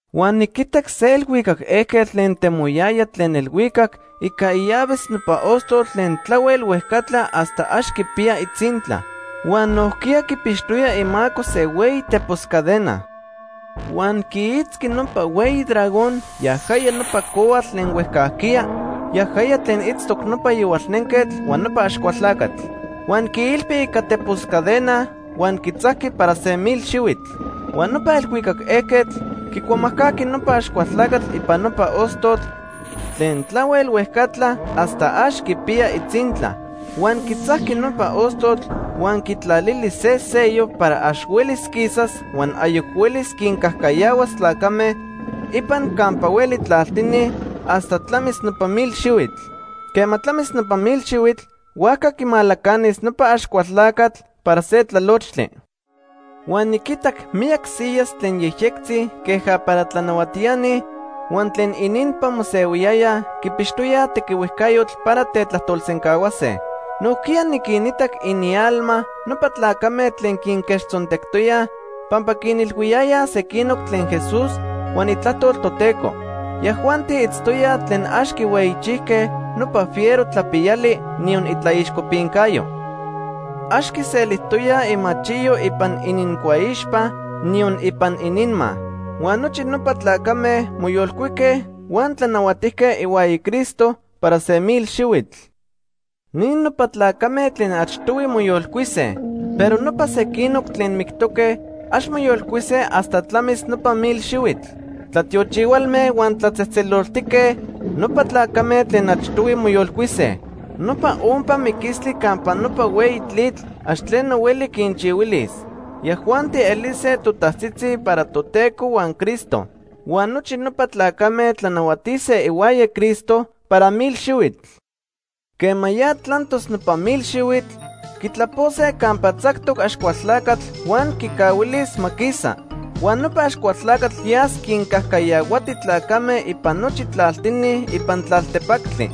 Huan niquitac se elhuicac ejquetl tlen temoyaya tlen elhuicac ica illaves nopa ostotl tlen tlahuel huejcatla hasta ax quipiya itzintla. Huan nojquiya quipixtoya imaco se hueyi tepos cadena. Huan quiitzqui nopa hueyi dragón, yajaya nopa cohuatl tlen huejcajquiya, yajaya tlen itztoc nopa Yohualnenquetl huan nopa Axcualtlacatl. Huan quiilpi ica tepos cadenas huan quitzajqui para se mil xihuitl. Huan nopa elhuicac ejquetl quicuamajcajqui nopa Axcualtlacatl ipan nopa ostotl tlen tlahuel huejcatla hasta ax quipiya itzintla. Huan quitzajqui nopa ostotl huan quitlalili se sello para ax huelis quisas huan ayoc huelis quincajcayahuas tlacame ipan campa hueli tlaltini hasta tlamis nopa mil xihuitl. Quema tlamis nopa mil xihuitl, huajca quimalacanis nopa Axcualtlacatl para se tlalochtli. Huan niquitac miyac siyas tlen yejyectzitzi queja para tlanahuatiani huan tlen ininpan mosehuiyayaj quipixtoyaj tequihuejcayotl para tetlajtolsencahuase. Nojquiya niquinitac inialma nopa tlacame tlen quinquechtzontectoyaj pampa quinilhuiyayaj sequinoc tlen Jesús huan itlajtol Toteco. Yajuanti itztoyaj tlen ax quihueyichijque nopa fiero tlapiyali, niyon itlaixcopincayo. Ax quiselijtoyaj imachiyo ipan inincuaixpa, niyon ipan ininma. Huan nochi nopa tlacame moyolcuique huan tlanahuatijque ihuaya Cristo para se mil xihuitl. Ni nopa tlacame tlen achtohui moyolcuise. Pero nopa sequinoc tlen mictoque ax moyolcuise hasta tlamis nopa mil xihuitl. Tlatiochihualme huan tlatzejtzeloltique nopa tlacame tlen achtohui moyolcuise. Nopa ompa miquistli campa nopa hueyi tlitl ax tleno hueli quinchihuilis. Yajuanti elise totajtzitzi para Toteco huan Cristo. Huan nochi nopa tlacame tlanahuatise ihuaya Cristo para mil xihuitl. Quema ya tlantos nopa mil xihuitl, quitlapose campa tzactoc Axcualtlacatl huan quicahuilis ma quisa. Huan nopa Axcualtlacatl yas quincajcayahuati tlacame ipan nochi tlaltini ipan tlaltepactli.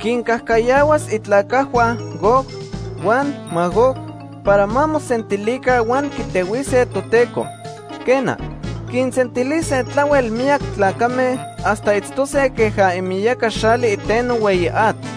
Quincajcayahuas itlacajhua Gog huan Magog para ma mosentilica huan quitehuise Toteco. Quena, quinsentilis tlahuel miyac tlacame hasta itztose queja imiyaca xali iteno hueyi atl.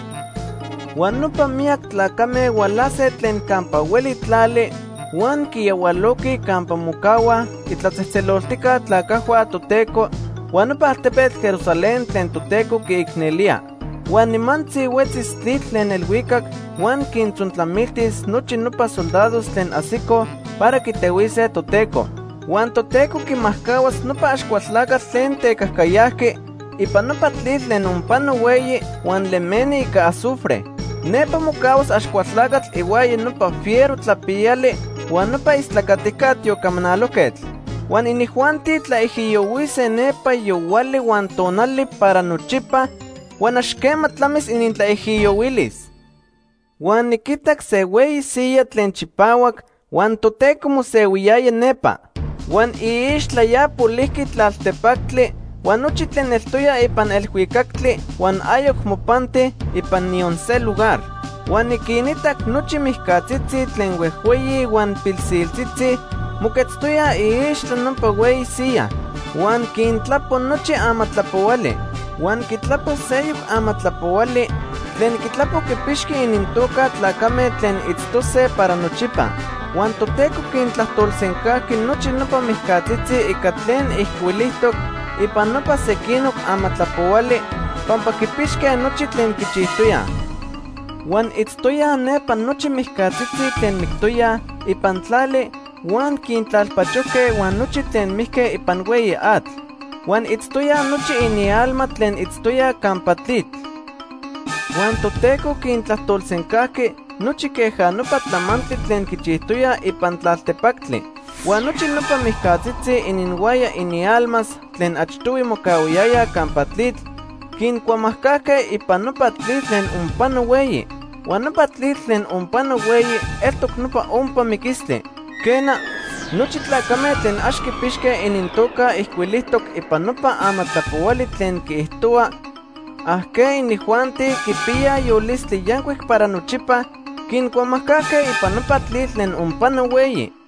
Huan nopa miyac tlacame hualase tlen campa hueli tlali huan quiyahualoquij campa mocahuaj itlatzejtzeloltijca tlacajhua Toteco huan nopa altepetl Jerusalén tlen Toteco quiicnelía. Huan nimantzi huetzis tlitl tlen elhuicac huan quintzontlamiltis nochi nopa soldados tlen ajsicoj para quitehuise Toteco. Huan Toteco quimajcahuas nopa Axcualtlacatl tlen tecajcayajqui ipan nopa tlitl tlen onpano hueyi huan lemeni ica azufre. Nepa mocahuas Axcualtlacatl ihuaya nopa fiero tlapiyali huan nopa istlacatica tiocamanalojquetl. Huan inijuanti tlaijiyohuise nepa yohuali huan tonali para nochipa huan ax quema tlamis inintlaijiyohuilis. Huan niquitac se hueyi siyaj tlen chipahuac huan Toteco mosehuiyaya nepa. Huan iixtla ya polijqui tlaltepactli huan nochi tlen eltoya ipan elhuicactli huan ayoc mopanti ipan niyon se lugar. Huan niquinitac nochi mijcatzitzi tlen huejhueyi huan pilsiltzitzi moquetztoyaj iixtla nopa hueyi siyaj. Huan quintlapo nochi amatlapohuali. Huan quitlapo seyoc amatlapohuali tlen quitlapo quipixqui inintoca tlacame tlen itztose para nochipa. Huan Toteco quintlajtolsencajqui nochi nopa mijcatzitzi ica tlen ijcuilijtoc ipan nopa sequinoc amatlapohuali pampa quipixque nochi tlen quichijtoyaj. Huan itztoyaj nepa nochi mijcatzitzi tlen mictoyaj ipan tlali huan quintlalpachojque huan nochi tlen mijque ipan hueyi atl. Huan itztoyaj nochi inialma tlen itztoyaj campa tlitl. Huan Toteco quintlajtolsencajqui nochi queja nopa tlamantli tlen quichijtoyaj ipan tlaltepactli. Huan nochi nopa mijcatzitzi ininhuaya inialmas tlen achtohui mocahuayayaj campa tlitl, quincuamajcajque ipan nopa tlitl tlen onpano hueyi. Huan nopa tlitl tlen onpano hueyi eltoc nopa ompa miquistli. Quena, nochi tlacame tlen ax quipixque inintoca ijcuilijtoc ipan nopa amatlapohuali tlen quiijtohua ajqueinijuanti quipiyaj yolistli yancuic para nochipa quincuamajcajque ipan nopa tlitl tlen onpano hueyi.